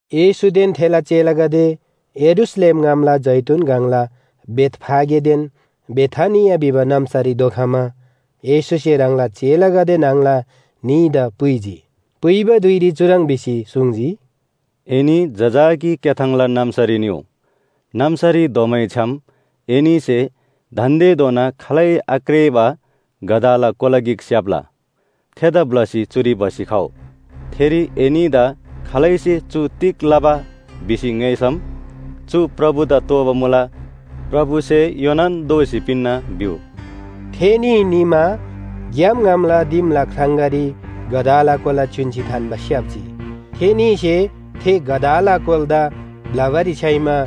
येशूदेन थेला चेलागदे यरूशलेम ङामला जैतून गङला बेथफागेदेन बेथानिया भिबा नाम्‍सारी धोखमा येशूसे ह्राङला चेलागदे न्‍हङला न्‍हीदा पुइजी। पुइबा धुइरी चुह्रङ् भिसी सुङ्जी, “एनी जजाकी क्‍याथाङला नाम्‍सारी निउ। नाम्‍सारी धोमैछ्‌याम एनीसे दान्‍देधोना खालै आक्रेःबा गधाला कोला गिक स्‍याप्‍ला। थेदा ब्‍लसी चुरी भसी खउ। थेरी एनीदा खालैसे चु तिग लबा? भिसी ङ्‌योइसम, चु प्रभुदा तोःबा मुला, प्रभुसे योनान दोःसी पिन्‍ना भिउ” भिसी पुइजी। थेनी निमा ग्‍याम ङामला दिमला ख्राङगारी गधाला कोला च्‍युन्‍सी थान्‍बा स्‍याप्‍जी। थेनीसे थे गधाला कोलादा ब्‍लबारी छ्‌याइमा,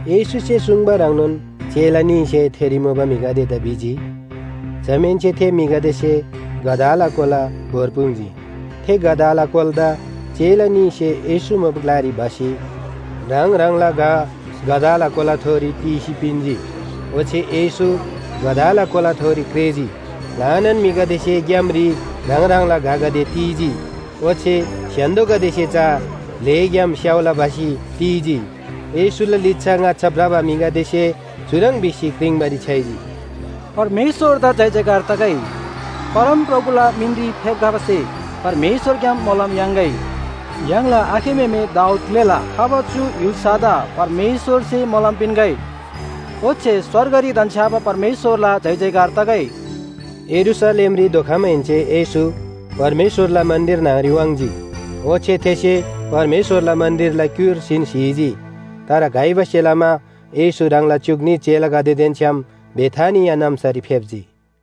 येशूसे सुङ्बा ह्रङ्नोन चेला न्‍हीसे थेरी मुबा म्‍हिगदेदा भिजी, जमाहेन्‍से थे म्‍हिगदेसे गधाला कोला भोर्पुङ्जी। थे गधाला कोलादा चेला न्‍हीसे येशू मुबा ग्‍लारी भसी ह्राङ ह्राङला घ गधाला कोलाथोरी तीसी पिन्‍जी, ओच्‍छे येशू गधाला कोलाथोरी क्रेःजी। ल्‍हानान म्‍हिगदेसे ग्‍यामरी ह्राङ ह्राङला घगदे ती‍जी, ओच्‍छे स्‍य्‍हान्‍दोगदेसे चा भ्‍लेग्‍याम स्‍याउला भसी ती‍जी। येशूला लिच्‍छा ङाच्‍छा भ्रबा म्‍हिगदेसे चुह्रङ् भिसी क्रिङ्बारी छ्‌याइजी “परमेश्‍वरदा जयजयकार तगै, परमप्रभुला मिनरी फेप्‍खबासे परमेश्‍वरग्‍याम मोलम याङ्‌गै। य्‍हाङला आखे म्‍हेमे दाऊद ग्‍लेला खबा चु य्‍हुल्‍सादा परमेश्‍वरसे मोलम पिन्‍गै। ओच्‍छे स्‍वर्गरी धन्‍छ्‌याबा परमेश्‍वरला जयजयकार तगै।” यरूशलेमरी धोखमाहेन्‍से येशू परमेश्‍वरला मन्‍दिर न्‍हङरी वाङ्‌जी। ओच्‍छे थेसे परमेश्‍वरला मन्‍दिरला क्‍युर्सीन स्‍हीजी। तर घइबासे लमा येशू ह्राङला च्‍युक न्‍ही चेलागदेदेन छ्‌याम बेथानिया नाम्‍सारी फेप्‍जी।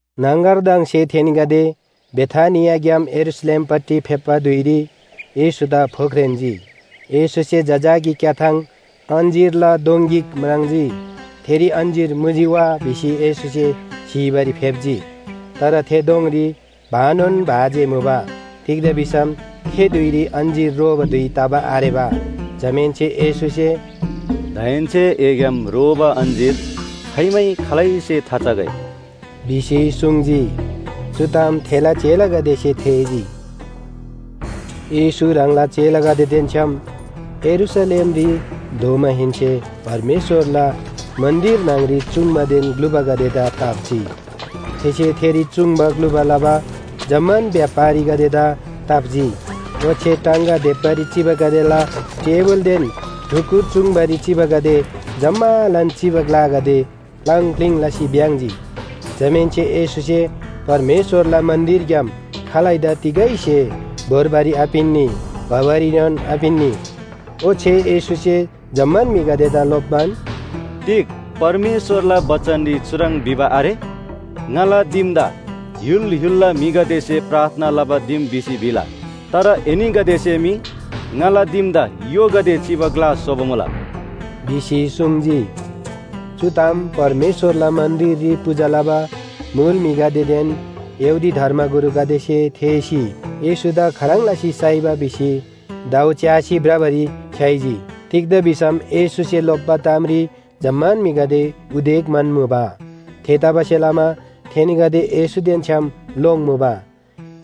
न्‍हङगरदङसे थेनीगदे बेथानियाग्‍याम यरूशलेमपट्टि फेप्‍बा धुइरी येशूदा फोख्रेन्‍जी। येशूसे जजाकी क्‍याथाङ अञ्‍जीरला दोङ गिक म्राङ्जी। थेरी अञ्‍जीर मुजी वा भिसी येशूसे स्‍हीबारी फेप्‍जी। तर थे दोङरी भानोन भा जे मुबा। तिग्‍दा भिसम थे धुइरी अञ्‍जीर रोबा धुइ तबा आरेबा। जमाहेन्‍से येशूसे “दाहेन्‍से एग्‍याम रोबा अञ्‍जीर खाइमै खालैसे थाचगै” भिसी सुङ्जी। चु ताम थेला चेलागदेसे थेःजी। येशू ह्राङला चेलागदेदेन छ्‌याम यरूशलेमरी धोमाहेन्‍से परमेश्‍वरला मन्‍दिर न्‍हङरी चूङ्बादेन ग्‍लुबागदेदा ताप्‍जी। थेसे थेरी चुङ्बा ग्‍लुबा लबा जम्‍मान व्‍यापारीगदेदा ताप्‍जी। ओच्‍छे टाङगा देप्‍बारी चिबागदेला टेबुलदेन ढुकुर चूङ्बारी चिबागदे जम्‍मालान चिबा ग्‍लागदे प्‍लाङ प्‍लिङ लसी भ्‍याङ्‍जी। जमाहेन्‍से येशूसे परमेश्‍वरला मन्‍दिरग्‍याम खालैदा तिगै स्‍हे भोर्बारी आपिन्‍नी भबारीएनोन आपिन्‍नी। ओच्‍छे येशूसे जम्‍मान म्‍हिगदेदा लोप्‍बान, “तिग परमेश्‍वरला बचनरी चुह्रङ् भिबा आरे? ‘ङाला दिमदा य्‍हुल य्‍हुलला म्‍हिगदेसे प्रार्थना लबा दिम भिसी भिला।’ तर एनीगदेसे मी ङाला दिमदा य्‍होगदे चिबा ग्‍ला स्‍होबा मुला” भिसी सुङ्जी। चु ताम परमेश्‍वरला मन्‍दिररी पूजा लबा मुल म्‍हिगदेदेन यहूदी धर्मगुरुगदेसे थेःसी येशूदा खाह्रङ् लसी साइबा भिसी दाउ च्‍यासी भ्रबारी छ्‌याइजी। तिग्‍दा भिसम येशूसे लोप्‍बा तामरी जम्‍मान म्‍हिगदे उदेक म्‍हन्‍मुबा। थेतबासेलमा थेनीगदे येशूदेन छ्‌याम लोङ्मुबा।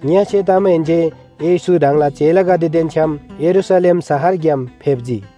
ङ्‍यसे तमाहेन्‍से येशू ह्राङला चेलागदेदेन छ्‌याम यरूशलेम शहरग्‍याम फेप्‍जी।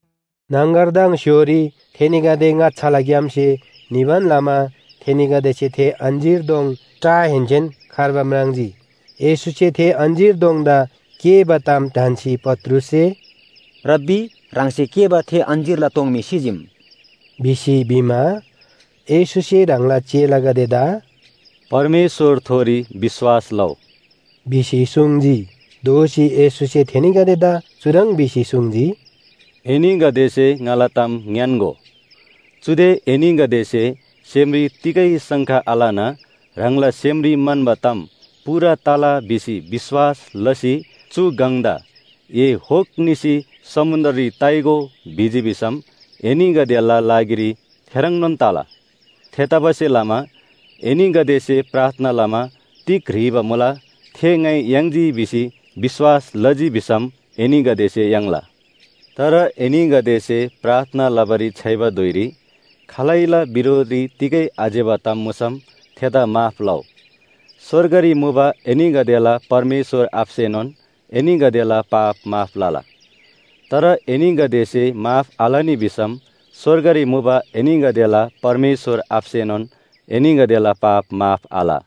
न्‍हङगरदङ स्‍य्‍होरी थेनीगदे ङाच्‍छालाग्‍याम्‍से निबान लमा थेनीगदेसे थे अञ्‍जीर दोङ टाहेन्‍सेन खर्बा म्राङ्जी। येशूसे थे अञ्‍जीर दोङदा केःबा ताम ढन्‍सी पत्रुससे “रब्‍बी, ह्राङसे केःबा थे अञ्‍जीरला दोङ मी सिजीम” भिसी भिमा, येशूसे ह्राङला चेलागदेदा “परमेश्‍वरथोरी विश्‍वास लउ” भिसी सुङ्जी। दोःसी येशूसे थेनीगदेदा चुह्रङ् भिसी सुङ्जी, “एनीगदेसे ङाला ताम ङ्‌यान्‍गो, चुदे एनीगदेसे सेमरी तिगै शङ्का आलना ह्राङला सेमरी म्‍हन्‍बा ताम पूरा तला भिसी विश्‍वास लसी चु गङदा ‘ए होक निसी समुन्‍द्ररी ताइगो’ भिजी भिसम एनीगदेला लागिरी थेह्रङ्नोन तला। थेतबासेलमा एनीगदेसे प्रार्थना लमा तिग ह्रीबा मुला, थे ङाइ याङ्जी भिसी विश्‍वास लजी भिसम एनीगदेसे याङ्ला। तर एनीगदेसे प्रार्थना लबारी छ्‌याइबा धुइरी खालैला बिरोधरी तिगै आज्‍यबा ताम मुसम थेदा माफ लउ। स्‍वर्गरी मुबा एनीगदेला परमेश्‍वर आबासेनोन एनीगदेला पाप माफ लला। तर एनीगदेसे माफ आलनी भिसम स्‍वर्गरी मुबा एनीगदेला परमेश्‍वर आबासेनोन एनीगदेला पाप माफ आल।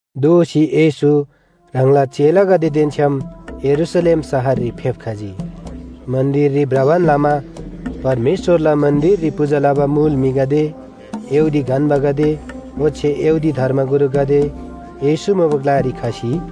दोःसी येशू ह्राङला चेलागदेदेन छ्‌याम यरूशलेम शहररी फेप्‍खजी। मन्‍दिररी भ्रबान लमा परमेश्‍वरला मन्‍दिररी पूजा लबा मुल म्‍हिगदे, यहूदी गन्‍बागदे ओच्‍छे यहूदी धर्मगुरुगदे येशू मुबा ग्‍लारी खसी,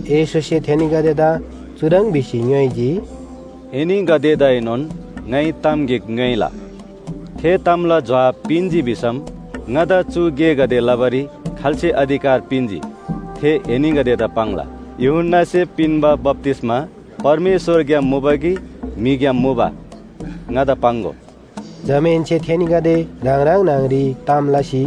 येशूसे थेनीगदेदा चुह्रङ् भिसी ङ्‌योइजी, “एनीगदेदाएनोन ङाइ ताम गिक ङ्‌योइला। थे तामला जोहाब पिन्‍जी भिसम ङादा चु गेगदे लबारी खाल्‍से अधिकार पिन्‍जी थे एनीगदेदा पाङ्ला। यूहन्‍नासे पिन्‍बा बप्‍तिस्‍मा परमेश्‍वरग्‍याम मुबा कि म्‍हिग्‍याम मुबा? ङादा पाङ्‍गो।” जमाहेन्‍से थेनीगदे ह्राङ ह्राङ न्‍हङरी ताम लसी,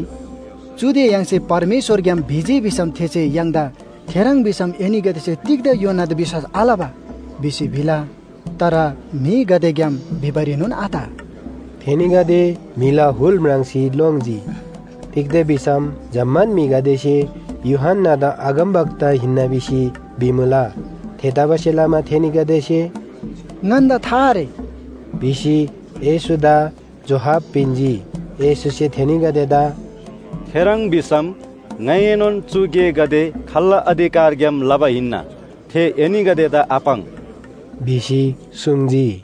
“चुदे य्‍हाङसे परमेश्‍वरग्‍याम भिजी भिसम थेसे य्‍हाङदा ‘थेह्रङ् भिसम एनीगदेसे तिग्‍दा यूहन्‍नादा विश्‍वास आलबा?’ भिसी भिला। तर म्‍हिगदेग्‍याम भिबारीनोन आत।” थेनीगदे म्‍हिला हुल म्राङ्सी लोङ्जी। तिग्‍दा भिसम जम्‍मान म्‍हिगदेसे यूहन्‍नादा अगमवक्ता हिन्‍ना भिसी भिमुला। थेतबासेलमा थेनीगदेसे “ङन्‍दा था आरे” भिसी येशूदा जोहाब पिन्‍जी। येशूसे थेनीगदेदा “थेह्रङ् भिसम ङाइएनोन चु गेगदे खाल्‍ला अधिकारग्‍याम लबा हिन्‍ना, थे एनीगदेदा आपाङ्” भिसी सुङ्जी।